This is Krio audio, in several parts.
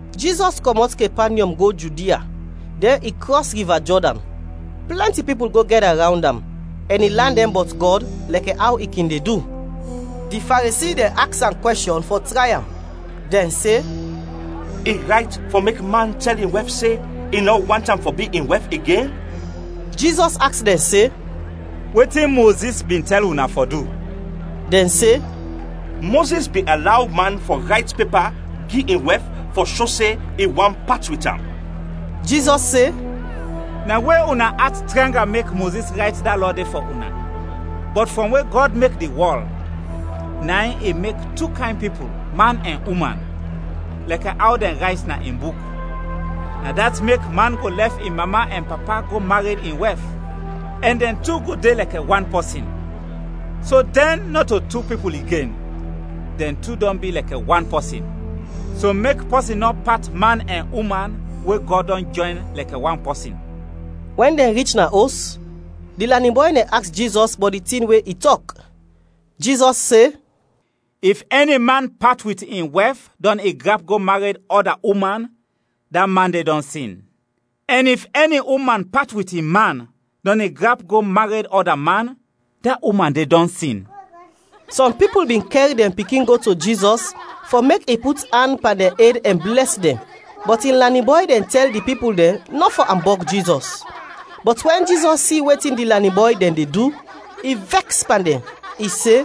Jizɔs kɔmɔt Kepanyɔm go Judia, dɛn i krɔs Riva Jɔdan. Plɛnti pipul go gɛda rawnd am, ɛn i lan dɛn bɔt Gɔd lɛkɛ aw i kin de du. Di Faresi dɛn aks am kwɛshɔn fɔ tray am; dɛn se, “I rayt fɔ mek man tɛl in wɛf se i nɔ want am fɔ bi in wɛf igen?” Jizɔs aks dɛn se, “Wetin Mozis bin tɛl una fɔ du?” Dɛn se, “Mozis bin alaw man fɔ rayt pepa gi in wɛf fɔ sho se i want pat wit am.” Jizɔs se, “Na we una at tranga mek Mozis rayt da lɔ de fɔ una. Bɔt frɔm we Gɔd mek di wɔl, na in ‘I mek tu kayn pipul, man ɛn uman;’ lɛkɛ aw dɛn rayt na in Buk. ‘Na dat mek man go lɛf in mama ɛn papa go mared in wɛf, ɛn dɛn tu go de lɛkɛ wan pɔsin’. So dɛn nɔto tu pipul igen, dɛn tu dɔn bi lɛkɛ wan pɔsin. So mek pɔsin nɔ pat man ɛn uman we Gɔd dɔn jɔyn lɛkɛ wan pɔsin.” Wɛn dɛn rich na os, di lanin bɔy dɛn aks Jizɔs bɔt di tin we i tɔk. Jizɔs se, “If ɛni man pat wit in wɛf, dɔn i grap go mared ɔda uman, da man de dɔn sin. Ɛn if ɛni uman pat wit in man, dɔn i grap go mared to ɔda man, da uman de dɔn sin.” Sɔm pipul bin kɛr dɛn pikin go to Jizɔs fɔ mek i put an pan dɛn ed ɛn blɛs dɛn, bɔt in lanin bɔy dɛn tɛl di pipul dɛn nɔ fɔ ambɔg Jizɔs. Bɔt wɛn Jizɔs si wetin di lanin bɔy dɛn de du, i vɛks pan dɛn, i se,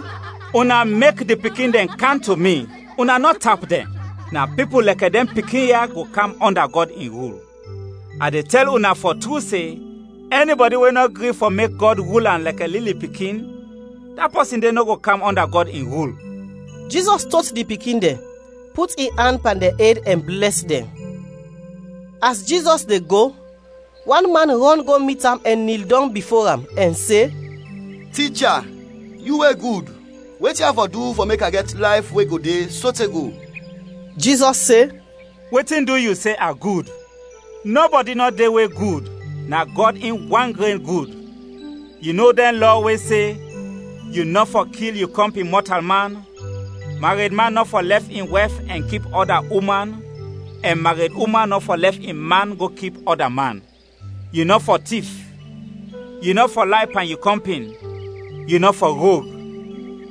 “Una mek di pikin dɛn kam to mi, una nɔ tap dɛn; na pipul lɛkɛ dɛn pikin ya, go kam ɔnda Gɔd in rul. A de tɛl una fɔ tru se, ɛnibɔdi we nɔ gri fɔ mek Gɔd rul am lɛkɛ lili pikin, da pɔsin de nɔ go kam ɔnda Gɔd in rul.” Jizɔs tot di pikin dɛn, put in an pan dɛn ed ɛn blɛs dɛn. As Jizɔs de go, wan man rɔn go mit am ɛn nil dɔng bifo am ɛn se, “Ticha, yu we gud, wetin a fɔ du fɔ mek a gɛt layf we go de sote go?” Jizɔs se, “Wetin du yu se a gud? Nɔbɔdi nɔ de we gud, na Gɔd in wan gren gud. Yu no dɛn lɔ we se: ‘Yu nɔ fɔ kil yu kɔmpin mɔtalman; mared man nɔ fɔ lɛf in wɛf ɛn kip ɔda uman ɛn mared uman nɔ fɔ lɛf in man go kip ɔda man; yu nɔ fɔ tif; yu nɔ fɔ lay pan yu kɔmpin; yu nɔ fɔ rog;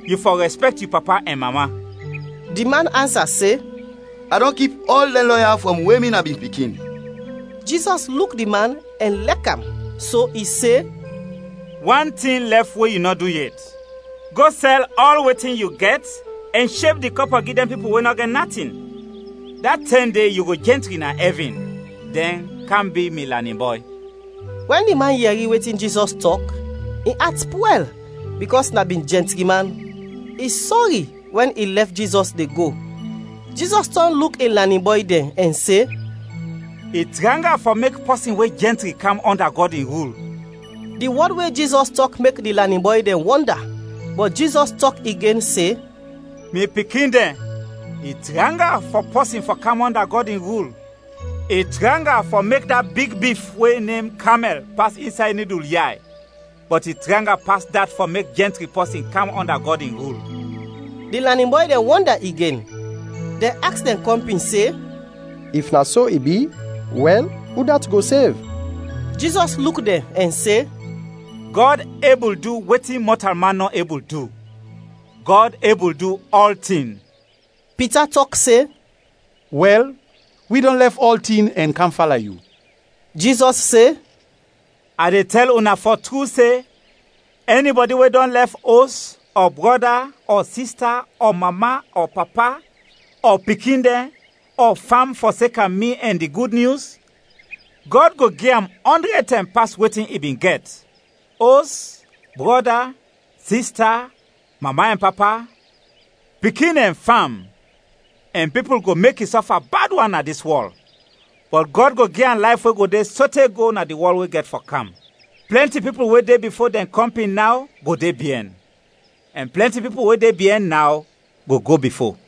yu fɔ rɛspɛkt yu papa ɛn mama.’” Di man ansa se, “A dɔn kip ɔl dɛn lɔ ya frɔm we mi na bin pikin.” Jizɔs luk di man ɛn lɛk am, so i se, “Wan tin lɛf we yu nɔ du yet, go sɛl ɔl wetin yu gɛt ɛn sheb di kɔpɔ gi dɛn pipul we nɔ gɛt natin, da tɛm de yu go jɛntri na ɛvin; dɛn, kam bi mi lanin bɔy.” Wɛn di man yɛri wetin Jizɔs tɔk, in at pwɛl bikɔs na bin jɛntri man. I sɔri wɛn i lɛf Jizɔs de go. Jizɔs tɔn luk in lanin bɔy dɛn ɛn se, “I tranga fɔ mek pɔsin we jɛntri kam ɔnda Gɔd in rul.” Di wɔd we Jizɔs tɔk mek di lanin bɔy dɛn wɔnda, bɔt Jizɔs tɔk igen se, “Mi pikin dɛn, i tranga fɔ pɔsin fɔ kam ɔnda Gɔd in rul. I tranga fɔ mek da big bif we nem kamɛl pas insay nidul yay, bɔt i tranga pas dat fɔ mek jɛntri pɔsin kam ɔnda Gɔd in rul.” Di lanin bɔy dɛn wɔnda igen; dɛn aks dɛn kɔmpin se, “If na so i bi, wɛl, udat go sev?” Jizɔs luk dɛn ɛn se, “Gɔd ebul du wetin mɔtalman nɔ ebul du; Gɔd ebul du ɔltin.” Pita tɔk se, “Wɛl, wi dɔn lɛf ɔltin ɛn kam fala yu!” Jizɔs se, “A de tɛl una fɔ tru se, ɛnibɔdi we dɔn lɛf os, ɔ brɔda, ɔ sista, ɔ mama, ɔ papa, ɔ pikin dɛn, ɔ fam fɔseka mi ɛn di Gud Nyus, Gɔd go gi am ɔndrɛd tɛm pas wetin i bin gɛt: os, brɔda, sista, mama ɛn papa, pikin ɛn fam; ɛn pipul go mek i sɔfa bad wan na dis wɔl, bɔt Gɔd go gi am layf we go de sote go na di wɔl we gɛt fɔ kam. Plɛnti pipul we de bifo dɛn kɔmpin naw go de biɛn, ɛn plɛnti pipul we de biɛn naw, go go bifo.”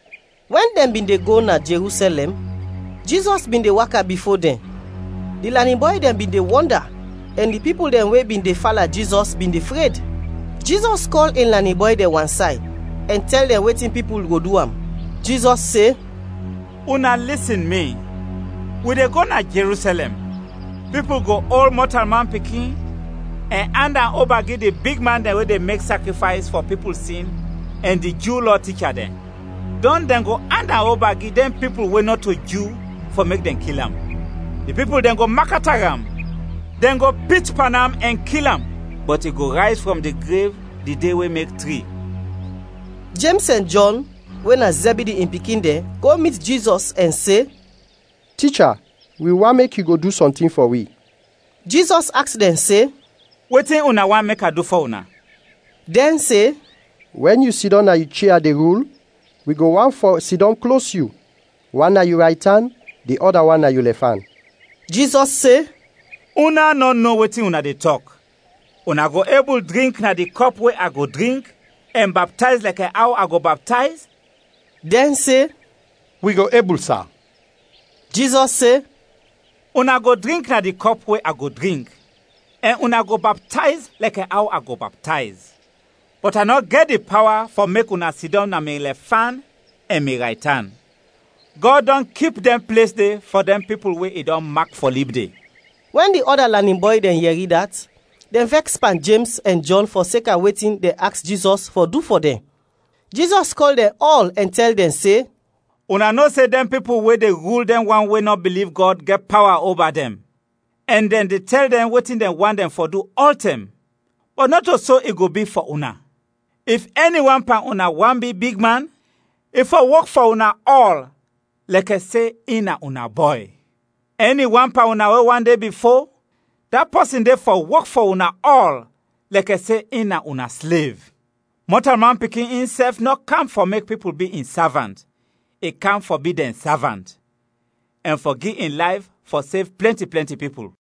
Wɛn dɛn bin de go na Jerusɛlɛm, Jizɔs bin de waka bifo dɛn. Di lanin bɔy dɛn bin de wɔnda, ɛn di pipul dɛn we bin de fala Jizɔs bin de fred. Jizɔs kɔl in lanin bɔy dɛn wansay ɛn tɛl dɛn wetin pipul go du am. Jizɔs se, “Una lisin mi, wi de go na Jerusɛlɛm, pipul go ol Mɔtalman Pikin ɛn and am oba gi di bigman dɛn we de mek sakrifays fɔ pipul sin ɛn di Ju Lɔ ticha dɛn. Dɔn dɛn go and am oba gi dɛn pipul we nɔto Ju fɔ mek dɛn kil am. Di pipul dɛn go makata am, dɛn go pit pan am ɛn kil am, bɔt i go rayz frɔm di grev di de we mek tri.” Jems ɛn Jɔn, we na Zɛbidi in pikin dɛn, go mit Jizɔs ɛn se, “Ticha, wi want mek yu go du sɔntin fɔ wi.” Jizɔs aks dɛn se, “Wetin una want mek a du fɔ una?” Dɛn se, “Wɛn yu sidɔm na yu chia de rul, wi go want fɔ sidɔm klos yu, wan na yu raytan, di ɔda wan na yu lɛfan.” Jizɔs se, “Una nɔ no wetin una de tɔk; una go ebul drink na di kɔp we a go drink, ɛn baptayz lɛkɛ aw a go baptayz?” Dɛn se, “Wi go ebul, sa!” Jizɔs se, “Una go drink na di kɔp we a go drink ɛn una go baptayz lɛkɛ aw a go baptayz, bɔt a nɔ gɛt di pawa fɔ mek una sidɔm na mi lɛfan ɛn mi raytan. Gɔd dɔn kip dɛn ples de fɔ dɛn pipul we i dɔn mak fɔ lib de.” Wɛn di ɔda lanin bɔy dɛn yɛri dat, dɛn vɛks pan Jems ɛn Jɔn fɔseka wetin dɛn aks Jizɔs fɔ du fɔ dɛn. Jizɔs kɔl dɛn ɔl ɛn tɛl dɛn se, “Una no se dɛn pipul we de rul dɛn wan we nɔ biliv Gɔd gɛt pawa oba dɛn, ɛn dɛn de tɛl dɛn wetin dɛn fɔ du ɔltɛm. Bɔt nɔto so i go bi fɔ una. If ɛni wan pan una want bi bigman, i fɔ wok fɔ una ɔl lɛkɛ se in na una bɔy. Ɛni wan pan una we want fɔ de bifo, da pɔsin de fɔ wok fɔ una ɔl lɛkɛ se in na una slev. Mɔtalman Pikin insɛf nɔ kam fɔ mek pipul bi in savant, i kam fɔ bi dɛn savant, ɛn fɔ gi in layf fɔ sev plɛnti plɛnti pipul.”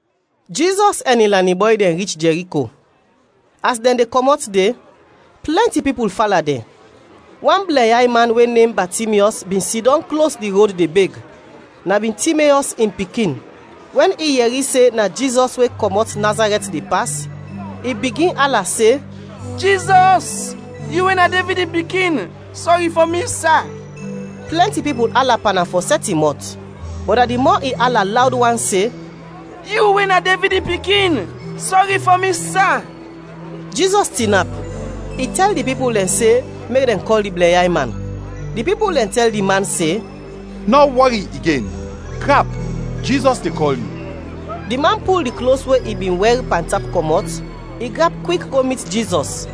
Jizɔs ɛn in lanin bɔy dɛn rich Jɛriko. As dɛn de kɔmɔt de, plɛnti pipul fala dɛn. Wan blɛnyay man we nem Batimyɔs bin sidɔm klos di rod de beg; na bin Timeyɔs in pikin. Wɛn i yɛri se na Jizɔs we kɔmɔt Nazarɛt de pas, i bigin ala se, “Jizɔs, yu we na Devid in pikin, sɔri fɔ mi, sa!” Plɛnti pipul ala pan am fɔ sɛt in mɔt, bɔt na di mɔ i ala lawd wan se, “Yu, we na Devid in pikin, sɔri fɔ mi, sa!” Jizɔs tinap, i tɛl di pipul dɛn se, mek dɛn kɔl di blɛnyay man. Di pipul dɛn tɛl di man se, “Nɔ wɔri igen, grap! Jizɔs de kɔl yu.” Di man pul di klos we i bin wɛr pantap kɔmɔt, i grap kwik go mit Jizɔs.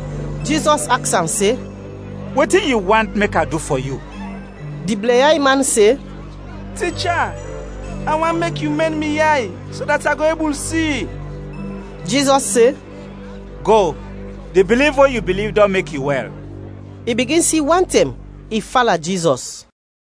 Jizɔs aks am se, “Wetin yu want mek a du fɔ yu?” Di blɛnyay man se, “Ticha, a want mek yu mɛn mi yay, so dat a go ebul si.” Jizɔs se, “Go, di biliv we yu biliv dɔn mek yu wɛl.” I bigin si wantɛm, i fala Jizɔs.